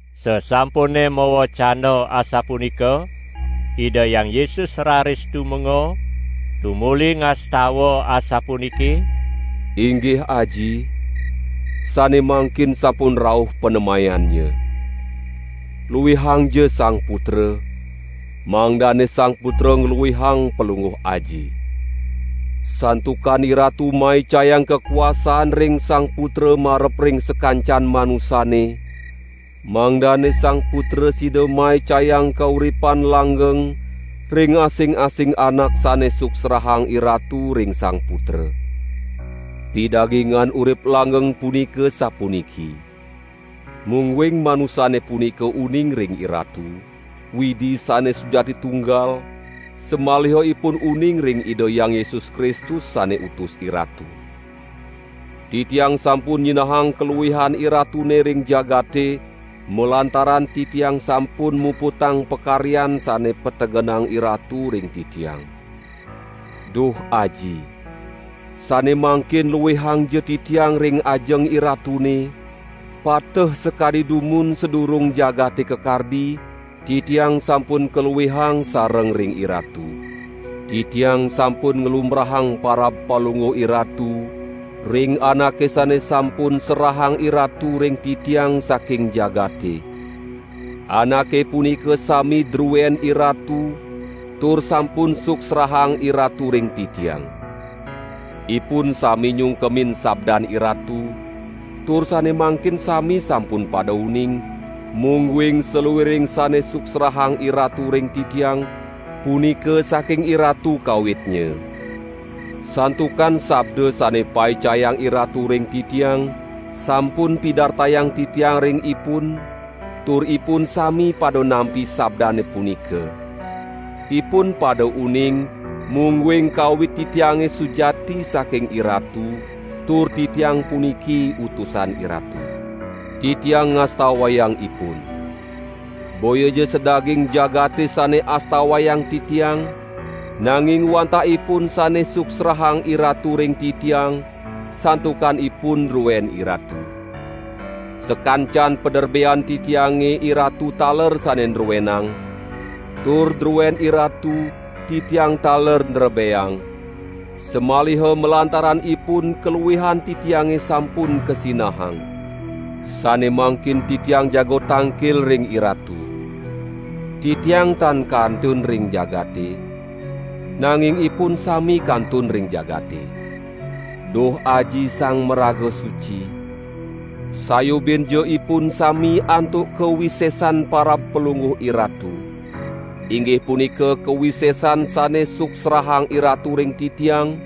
Sasampune mawecana asapunika, Ida Hyang Yesus raris tumenga, tumuli ngastawa asapuniki: "Inggih Aji, sane mangkin sampun rauh panemayannya. Luihangja Sang Putra, mangdane Sang Putra ngluihang Palungguh Aji. Santukan IRatu maicayang kakuasaan ring Sang Putra marep ring sakancan manusane, mangdane Sang Putra sida maicayang kauripan langgeng ring asing-asing anak sane suksrahang IRatu ring Sang Putra. Pidagingan urip langgeng punika sapuniki: Mungguing manusane punika uning ring IRatu, Widi sane sujati Tunggal, samaliha ipun uning ring Ida Hyang Yesus Kristus, sane utus IRatu. Titiang sampun nyinahang kaluihan IRatune ring jagate, malantaran Titiang sampun muputang pakaryan sane pategenang IRatu ring Titiang. Duh Aji, sane mangkin luihangja Titiang ring ajeng IRatune pateh sakadi dumun sadurung jagate kakardi, Titiang sampun luihang sareng ring IRatu. Titiang sampun nglumbrahang parab Palungguh IRatu ring anake sane sampun serahang IRatu ring Titiang saking jagate. Anake punika sami druen IRatu tur sampun suksrahang IRatu ring Titiang. Ipun sami nyungkemin sabdan IRatu, tur sane mangkin sami sampun pada uning, mungguing saluiring sane suksrahang IRatu ring Titiang, punika saking IRatu kawitnya. Santukan sabda sane paicayang IRatu ring Titiang, sampun pidartayang Titiang ring ipun, tur ipun sami pada nampi sabdane punika; ipun pada uning mungguing kawit Titiange sujati saking IRatu tur Titiang puniki utusan IRatu. Titiang ngastawayang ipun. Boyaja sadaging jagate sane astawayang Titiang, nanging wantah ipun sane suksrahang IRatu ring Titiang, santukan ipun druen IRatu. Sakancan paderbean Titiange IRatu taler sane nruenang, tur druen IRatu Titiang taler nrebeang, samaliha malantaran ipun kaluihan Titiange sampun kasinahang. Sane mangkin Titiang jaga tangkil ring IRatu. Titiang tan kantun ring jagate, nanging ipun sami kantun ring jagate. Duh Aji Sang Maraga Suci, sayubinja ipun sami antuk kawisesan parab Palungguh IRatu, inggih punika kawisesan sane suksrahang IRatu ring Titiang,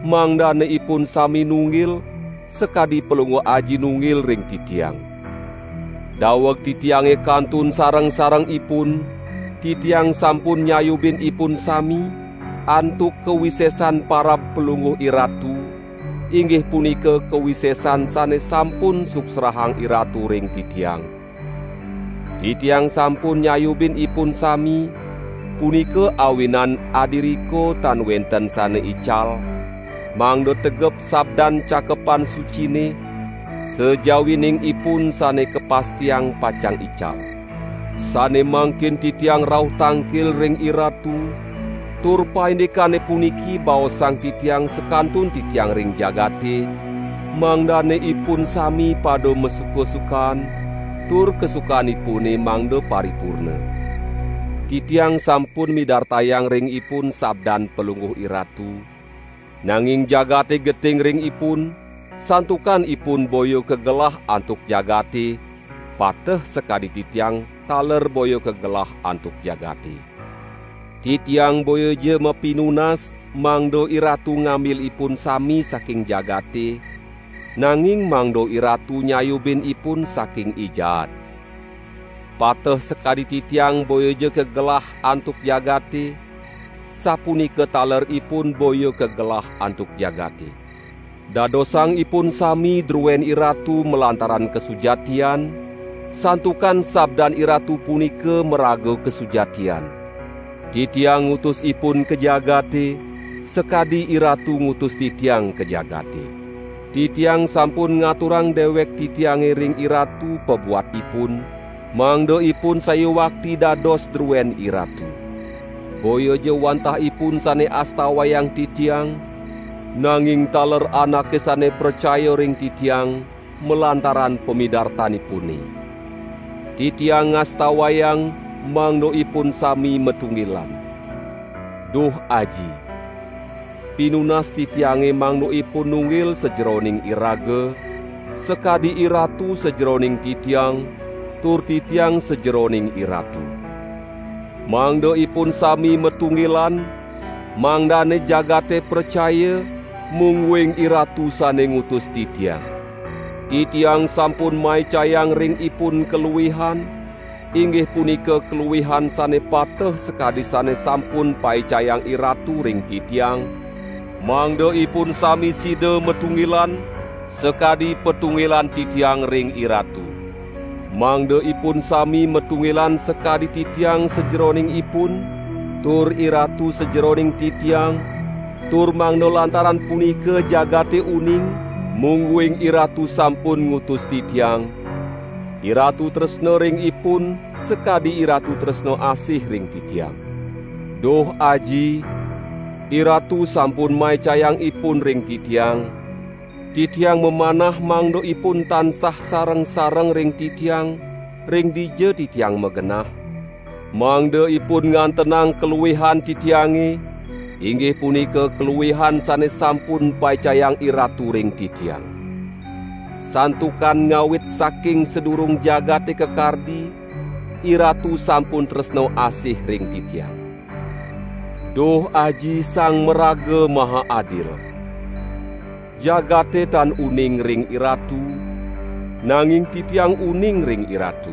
mangdane ipun sami nunggil, sakadi Palungguh Aji nunggil ring Titiang. Daweg Titiange kantun sareng-sareng ipun, Titiang sampun nyayubin ipun sami, antuk kawisesan parab Palungguh IRatu, inggih punika kawisesan sane sampun suksrahang IRatu ring Titiang. Titiang sampun nyayubin ipun sami, punika awinan adiriko tan wenten sane ical, mangda tegep sabdan Cakepan Sucine, sajawining ipun sane kapastiang pacang ical. Sane mangkin Titiang rauh tangkil ring IRatu tur paindikane puniki baosang Titiang sakantun Titiang ring jagate mangdane ipun sami pada masuka-sukaan tur kasukanipune mangda paripurna. Titiang sampun midartayang ring ipun sabdan Palungguh IRatu, nanging jagate geting ring ipun, santukan ipun boya kagelah antuk jagate pateh sakadi Titiang taler boya kagelah antuk jagate. Titiang boyaja mapinunas mangda IRatu ngambil ipun sami saking jagate, nanging mangda IRatu nyayubin ipun saking I Jaat. Pateh sakadi Titiang boyaja kagelah antuk jagate, sapunika taler ipun boya kagelah antuk jagate. Dadosang ipun sami druen IRatu malantaran kasujatian, santukan sabdan IRatu punika maraga kasujatian. Titiang ngutus ipun ka jagate, sakadi IRatu ngutus Titiang ka jagate. Titiang sampun ngaturang dewek Titiange ring IRatu pabuat ipun, mangda ipun sayuakti dados druen IRatu. Boyaja wantah ipun sane astawayang Titiang, nanging taler anake sane pracaya ring Titiang, malantaran pamidartanipune. Titiang ngastawayang, mangda ipun sami matunggilan. Duh Aji! Pinunas Titiange mangda ipun nunggil sajeroning iraga, sakadi IRatu sajeroning Titiang tur Titiang sajeroning IRatu. Mangda ipun sami matunggilan, mangdane jagate pracaya, mungguing IRatu sane ngutus Titiang. Titiang sampun maicayang ring ipun kaluihan, inggih punika kaluihan sane pateh sakadi sane sampun paicayang IRatu ring Titiang, mangda ipun sami sida matunggilan, sakadi patunggilan Titiang ring IRatu. Mangda ipun sami matunggilan sakadi Titiang sajeroning ipun, tur IRatu sajeroning Titiang, tur mangda lantaran punika jagate uning, mungguing IRatu sampun ngutus Titiang; IRatu tresna ring ipun sakadi IRatu tresna asih ring Titiang. Duh Aji! IRatu sampun maicayang ipun ring Titiang, Titiang mamanah mangda ipun tansah sareng-sareng ring Titiang ring dija Titiang magenah, mangda ipun ngantenang kaluihan Titiange, inggih punika kaluihan sane sampun paicayang IRatu ring Titiang. Santukan ngawit saking sadurung jagate kakardi, IRatu sampun tresna asih ring Titiang. Duh Aji Sang Maraga Maha Adil! Jagate tan uning ring IRatu, nanging Titiang uning ring IRatu.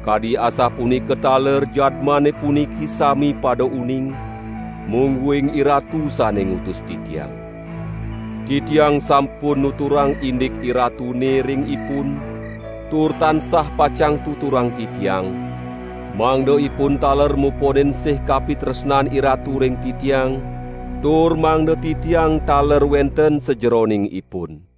Kadi asapunika taler jadmane puniki sami pada uning, mungguing IRatu sane ngutus Titiang. Titiang sampun nuturang indik IRatune ring ipun tur tansah pacang tuturang Titiang, mangda ipun taler muponin sih kapitresnan IRatu ring Titiang, tur mangda Titiang taler wenten sajeroning ipun."